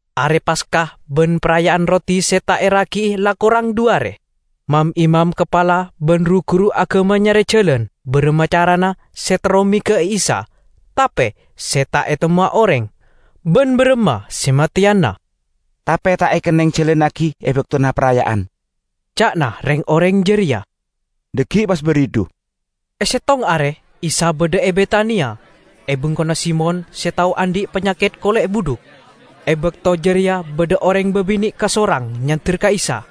Are Paska ban Paraya'an Roti Se Ta' Eragi'i la korang dhu are. Mam-imam kapala ban ru-guru agama nyare jalan baramma carana se terro mega'a Isa tape se ta' etemmowa oreng, ban baramma se mateyana. "Tape ta' ekenneng jalannagi e baktona paraya'an," ca'na reng-oreng jareya, "dhaggi' pas baridhu." E settong are Isa badha e Betania, e bengkona Simon se tao andhi' panyaket kole' budhuk. E bakto jareya badha oreng babine' kasorang nyander ka Isa.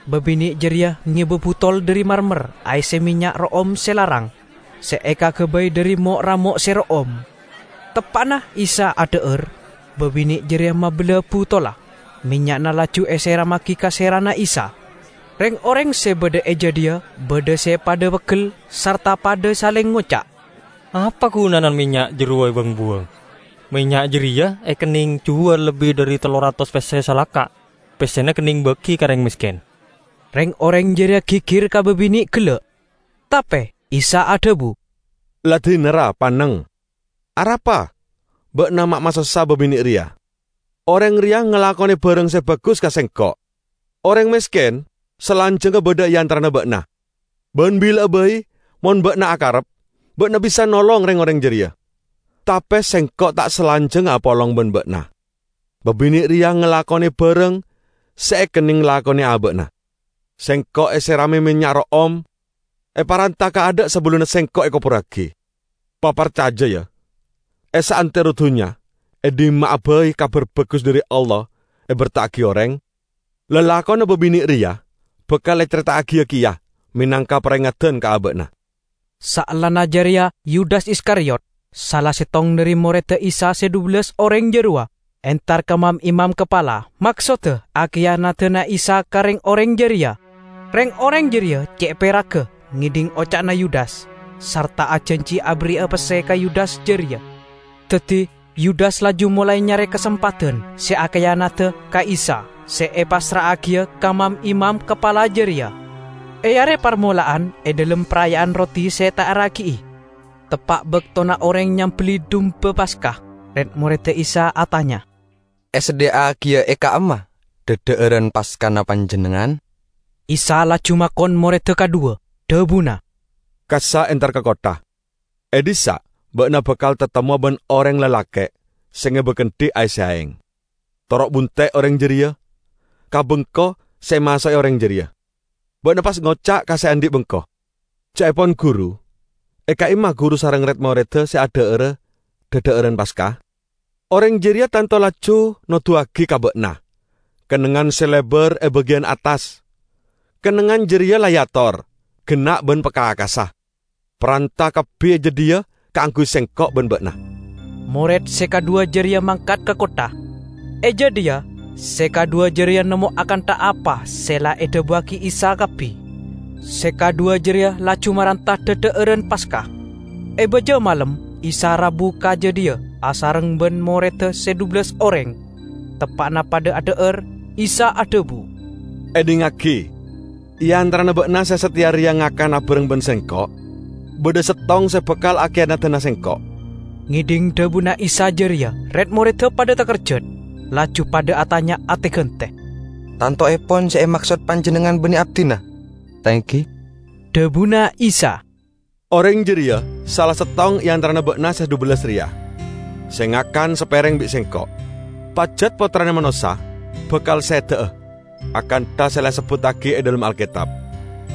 Babine' jareya ngeba butol dhari marmar aesse mennya' ro'om se larang, se ekagabay dhari mo'-ramo' se ro'om. Teppa'na Isa adha'ar, babine' jareya mabella butolla, mennya'na laju eserammagi ka serana Isa. Reng-oreng se badha e jadhiya badha se padha peggel sarta padha saleng ngoca', "Apa gunana mennya' jarowa ewang-buwang? Mennya' jareya ekenneng juwal lebbi dhari tello ratos pesse salaka, pessena ekenneng bagi ka oreng mesken!" Reng-oreng jareya gigir ka babine' gella'. Tape Isa adhabu, "La dina, ra, panneng! Arapa ba'na ma' masossa babine' reya? Oreng reya ngalakone barang se bagus ka Sengko'. Oreng mesken salanjangnga badha e antarana ba'na, ban bila'a bai mon ba'na akarep, ba'na bisa nolong reng-oreng jareya. Tape Sengko' ta' salanjangnga apolong ban ba'na. Babine' reya ngalakone barang se ekenneng lakone aba'na. Sengko' eserame mennya' ro'om, eparanta kaadha' sabellunna Sengko' ekoburragi. Paparcaja, ya! E saantero dunnya, e dhimma'a bai Kabar Bagus dhari Allah eberta'agi oreng, lalakonna babine' reya bakal ecareta'agiya keya menangka parengeddan ka aba'na." Saellana jareya Yudas Iskariyot, sala settong dhari moredda Isa se dhubellas oreng jarowa, entar ka mam-imam kapala, maksodda akiyanadana Isa ka reng-oreng jareya. Reng-oreng jareya ce' peragga ngedhing oca'na Yudas, sarta ajanji aberri'a pesse ka Yudas jareya. Daddi Yudas laju molae nyare kasempadan se akiyanada ka Isa se epassra'agiya ka mam-imam kapala jareya. E are parmola'an e dhalem Paraya'an Roti Se Ta' Eragi'i, teppa' baktona oreng nyambelli dumba Paska, red-moredda Isa atanya, "Esadhiya'agiya e ka'imma dhadha'aran Paskana Panjennengngan?" Isa laju makon moredda kadhuwa, dhabuna, "Kassa' entar ka kottha, e dhissa' ba'na bakal tatemmowa ban oreng lalake' se ngeba kendhi aesse aeng. Toro' bunte' oreng jareya ka bengko se emaso'e oreng jareya. Ba'na pas ngoca' ka se andhi' bengko, 'Ca'epon Guru, e ka'imma Guru sareng red-moredda se adha'ara dhadha'aran Paska?' Oreng jareya tanto laju noduwagi ka ba'na kennengngan se lebar e bagiyan attas. Kennengngan jareya la eator, genna' ban pakakassa. Paranta kabbi e jadhiya kaangguy Sengko' ban ba'na." Mored se kadhuwa jareya mangkat ka kottha. E jadhiya se kadhuwa jareya nemmo akantha apa se la edhabuwagi Isa kabbi; se kadhuwa jareya laju maranta dhadha'aran Paska. E baja malem Isa rabu ka jadhiya asareng ban moredda se dhubellas oreng. Teppa'na padha adha'ar, Isa adhabu, "Edhingngagi: e antarana ba'na se sateya reya ngakan abareng ban Sengko', badha settong se bakal akiyanadana Sengko'." Ngedhing dhabuna Isa jareya red-moredda padha takerjat, laju padha atanya ate-gante, "Tantoepon se emaksod Panjennengngan banne abdina, ta' enggi?" Dhabuna Isa, "Oreng jareya sala settong e antarana ba'na se dhubellas reya, se ngakan sapereng bi' Sengko'. Pajat Pottrana Manossa bakal seda'a akantha se la esebbuttagi e dhalem Alketab.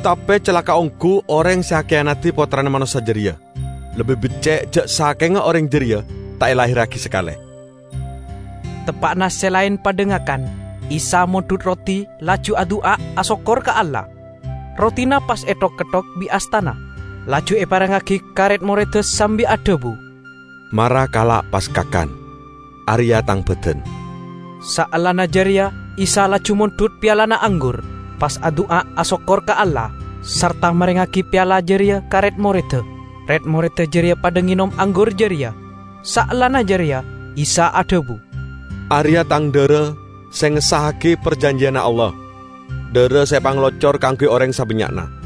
Tape calaka' onggu oreng se akiyanadi Pottrana Manossa jareya! Lebbi becce' ja' sakenga oreng jareya ta' elahirragi sakale!" Teppa'na se laen padha ngakan, Isa mondhut roti laju adu'a asokkor ka Allah. Rotina pas ethok-ketthok bi' astana, laju eparengngagi ka red-moredda sambi adhabu, "Mara kala' pas kakan, areya' Tang badan." Saellana jareya Isa laju mondhut pialana anggur, pas adu'a asokkor ka Allah, sarta marengngagi piala jareya ka red-moredda; red-moredda jareya padha ngenom anggur jareya. Saellana jareya Isa adhabu, "Areya' Tang dhara se ngessa'agi parjanjiyanna Allah, dhara se epangalocor kaangguy oreng sabannya'na.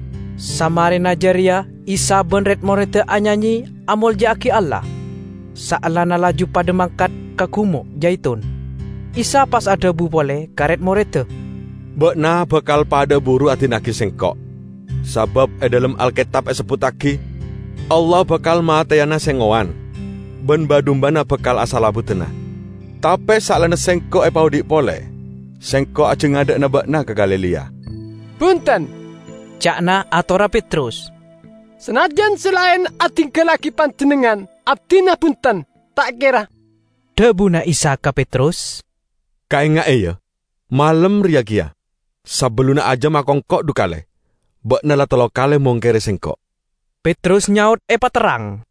Samarena jareya Isa ban red-moredda anyanye amolja'agi Allah. Saellana laju padha mangkat ka Gumo' Jaitun. Isa pas adhabu pole ka red-moredda, "Ba'na bakal padha'a buru adina'agi Sengko'. Sabab e dhalem Alketab esebbuttagi, 'Allah bakal mateyana se ngowan, ban ba-dumbana bakal asalebbudana.' Tape saellana Sengko' epaodhi' pole, Sengko' ajangadha'ana ba'na ka Galilea." "Bunten," ca'na atorra Petrus, "sanajjan se laen adinggallagi Panjennengngan, abdina bunten, ta' kera." Dhabuna Isa ka Petrus, "Kaenga'e, ya, malem reya keya, sabellunna ajam akongko' dhu kale, ba'na la tello kale mongkere Sengko'." Petrus nyaot epaterrang,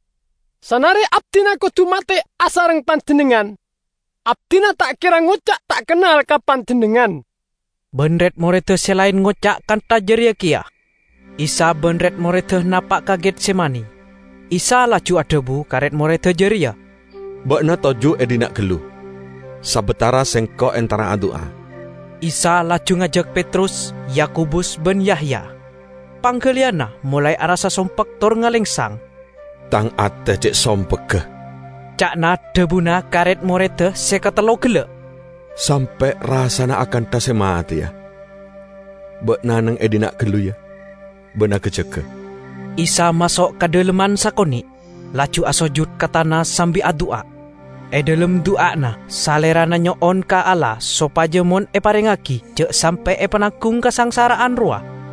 "Sanare abdina kodu mate asareng Panjennengngan, abdina ta' kera ngoca' ta' kennal ka Panjennengngan!" Ban red-moredda se laen ngoca' kantha jareya keya. Isa ban red-moredda napa' ka Getsemani; Isa laju adhabu ka red-moredda jareya, "Ba'na toju' e dhinna' gallu sabatara Sengko' entara adu'a." Isa laju ngajak Petrus, Yakobus ban Yahya. Panggaliyanna molae arassa sompek tor ngalengsang. "Tang ate ce' sompegga," ca'na dhabuna ka red-moredda se katello gella', "sampe' rassana akantha se mateya. Ba'na neng e dhinna' gallu, ya, ban aga-jaga!" Isa maso' ka dhalemman sakone', laju asojud ka tana sambi adu'a. E dhalem du'ana Salerana nyo'on ka Allah sopaja mon eparengngagi ja' sampe' epananggung kasangsara'an rowa.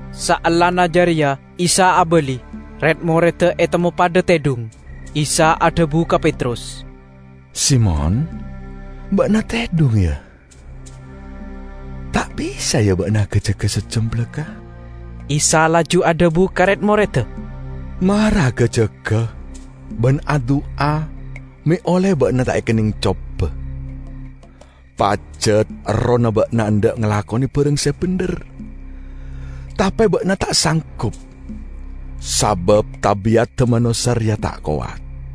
Saellana jareya Isa abali, red-moredda etemmo padha tedhung. Isa adhabu ka Petrus, "Simon, ba'na tedhung, ya? Ta' bisa, ya, ba'na aga-jaga saejjam balakka'?" Isa laju adhabu ka red-moredda, "Mara aga-jaga ban adu'a me' olle ba'na ta' ekenneng coba. Pajat, errohna ba'na endha' ngalakone barang se bendher, tape ba'na ta' sanggup sabab tabi'adda manossa reya ta' kowat."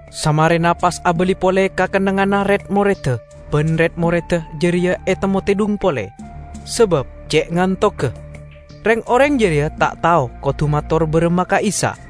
Samarena pas abali pole ka kennengnganna red-moredda ban red-moredda jareya etemmo tedhung pole, sabab ce' ngantogga. Reng-oreng jareya ta' tao kodu mator baramma ka Isa.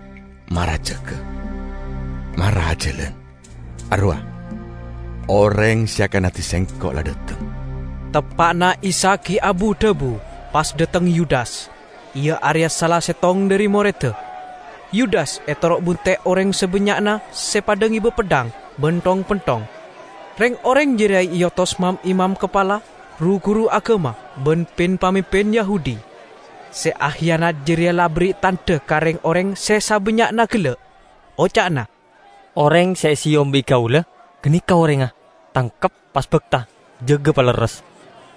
Mara jaga, mara ajalan! Arowa' oreng se akiyanadi Sengko' la dhateng!" Teppa'na Isa gi' abu-dhabu, pas dhateng Yudas, iya areya sala settong dhari moredda. Yudas etoro' bunte' oreng sabannya'na se padha ngeba peddhang ban thong-penthong. Reng-oreng jareya eotos mam-imam kapala, ru-guru agama ban pin-pamimpin Yahudi. Se akiyanat jareya la aberri' tandha ka reng-oreng se sabannya'na gella', oca'na, "Oreng se eseyom bi' kaula, ganeka orengnga. Tangkep, pas bakta, jaga palerres."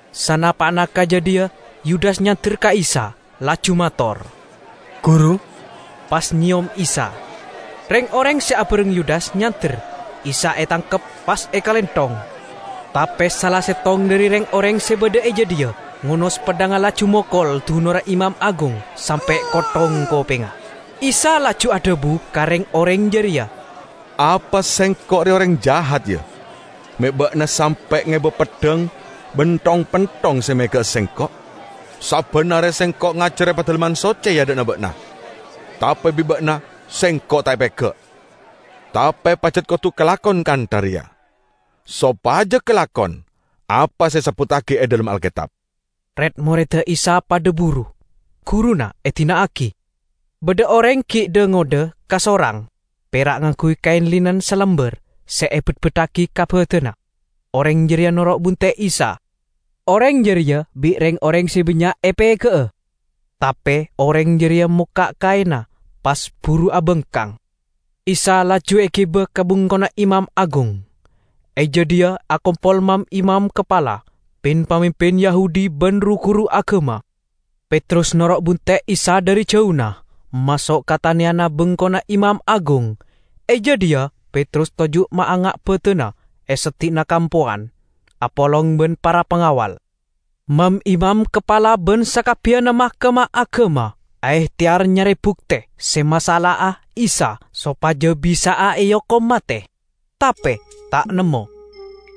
Sanapa'na ka jadhiya, Yudas nyander ka Isa, laju mator, "Guru!" pas nyeyom Isa. Reng-oreng se abareng Yudas nyander, Isa etangkep, pas ekalenthong. Tape sala settong dhari reng-oreng se badha e jadhiya ngonos peddhangnga laju mokol dunorra imam agung sampe' kotthong kopengnga. Isa laju adhabu ka reng-oreng jareya, "Apa Sengko' reya oreng jahat, ya, me' ba'na sampe' ngeba peddhang ban thong-penthong se mega'a Sengko'? Sabban are Sengko' ngajar e Padalemman Socce e adha'na ba'na, tape bi' ba'na Sengko' ta' epega'. Tape pajat kodu kalakon kantha reya, sopaja kalakon apa se esebbuttagi e dhalem Alketab." Red-moredda Isa padha buru, guruna edina'agi. Badha oreng gi' dha-ngodha kasorang, pera' ngangguy kaen linen salambar se ebetbeddagi ka badanna; oreng jareya noro' bunte' Isa. Oreng jareya bi' reng-oreng se bannya' epega'a, tape oreng jareya mokka' kaenna, pas buru abangkang. Isa laju egiba ka bengkona imam agung. E jadhiya akompol mam-imam kapala, pin-pamimpin Yahudi ban ru-guru agama. Petrus noro' bunte' Isa dhari jauna, maso' ka taneyanna bengkona imam agung. E jadhiya Petrus toju' maanga' badanna e seddi'na kampowan, apolong ban para pangawal. Mam-imam kapala ban sakabbiyanna Mahkamah Agama aehteyar nyare bukte se masala'a Isa sopaja bisa'a eokom mate, tape ta' nemmo.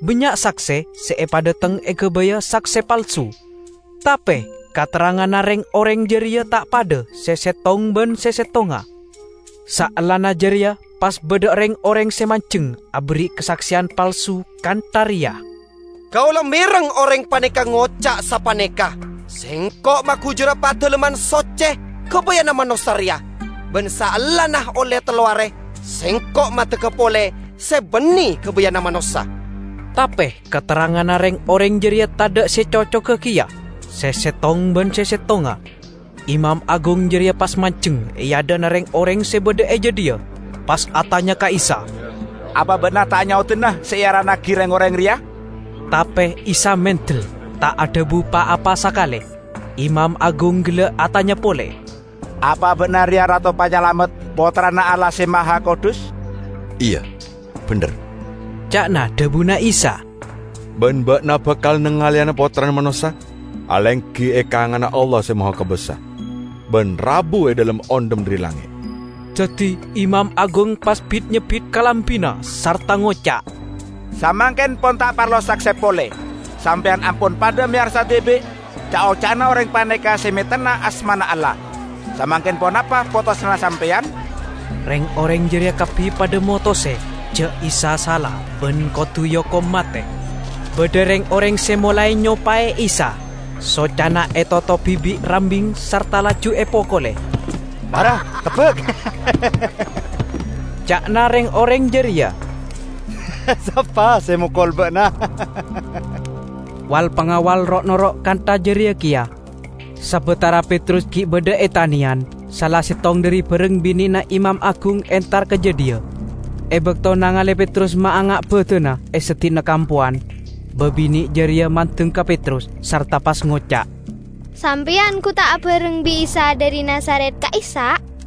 Bannya' sakse se epadhateng egabaya sakse palsu, tape katerranganna reng-oreng jareya ta' padha se settong ban settongnga. Saellana jareya pas badha reng-oreng se manjeng aberri' kasakseyan palsu kantha reya, "Kaula mereng oreng paneka ngoca' sapaneka, 'Sengko' magujura Padalemman Socce gabayanna manossa reya, ban saellana olle tello are Sengko' maddegga pole se banne gabayanna manossa.' " Tape katerranganna reng-oreng jareya tadha' se cocoga keya se settong ban settongnga. Imam agung jareya pas manjeng e adha'na reng-oreng se badha e jadhiya, pas atanya ka Isa, "Apa ba'na ta' nyaodana se earannagi reng-oreng reya?" Tape Isa mendel, ta' adhabu pa-apa sakale. Imam agung gella' atanya pole, "Apa ba'na reya Rato Panyalamet, Pottrana Allah Se Mahakudus?" "Iya, bendher," ca'na dhabuna Isa, "ban ba'na bakal nangaleyana Pottrana Manossa alenggi e kanganna Allah Se Mahakobasa, ban rabu e dhalem ondhem dhari langnge'!" Daddi imam agung pas bit-nyebbit kalambina sarta ngoca', "Samangken pon ta' parlo sakse pole! Sampeyan ampon padha meyarsa dibi' ca'-oca'na oreng paneka se metenna asmana Allah. Samangken ponapa potosanna sampeyan?" Reng-oreng jareya kabbi padha motose ja' Isa sala ban kodu eokom mate. Badha reng-oreng se molae nyopae Isa, socana etotobi bi' rambing sarta laju epokole. "Mara tebbak," ca'na reng-oreng jareya, "sapa se mokol ba'na?" Wal-pangawal ro'-noro' kantha jareya keya. Sabatara Petrus gi' badha e taneyan, sala settong dhari bareng bine'na imam agung entar ka jadhiya. E bakto nangale Petrus maanga' badanna e seddi'na kampowan, babine' jareya mandeng ka Petrus sarta pas ngoca', "Sampeyan gu ta' abareng bi' Isa dhari Nazaret ka'issa'?"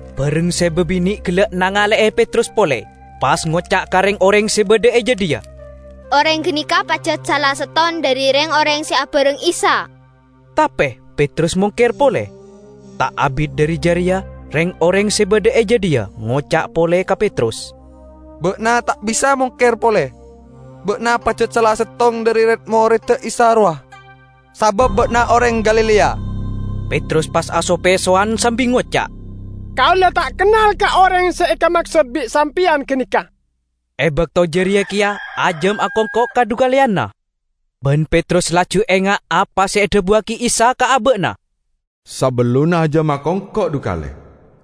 Bareng se babine' gella' nangale'e Petrus pole, pas ngoca' ka reng-oreng se badha e jadhiya, "Oreng ganeka pajat sala settong dhari reng-oreng se abareng Isa!" Tape Petrus mongker pole. Ta' abit dhari jareya reng-oreng se badha e jadhiya ngoca' pole ka Petrus, "Ba'na ta' bisa mongker pole. Ba'na pajat sala settong dhari red-moredda Isa rowa, sabab ba'na oreng Galilea!" Petrus pas aso-pesowan sambi ngoca', "Kaula ta' kennal ka oreng se ekamaksod bi' sampeyan ganeka!" E bakto jareya keya ajam akongko' kadhukaleyanna. Ban Petrus laju enga' apa se edhabuwagi Isa ka aba'na, "Sabellunna ajam akongko' dhu kale,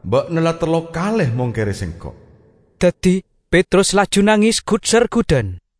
ba'na la tello kale mongkere Sengko'." Daddi Petrus laju nanges gut-sergudan.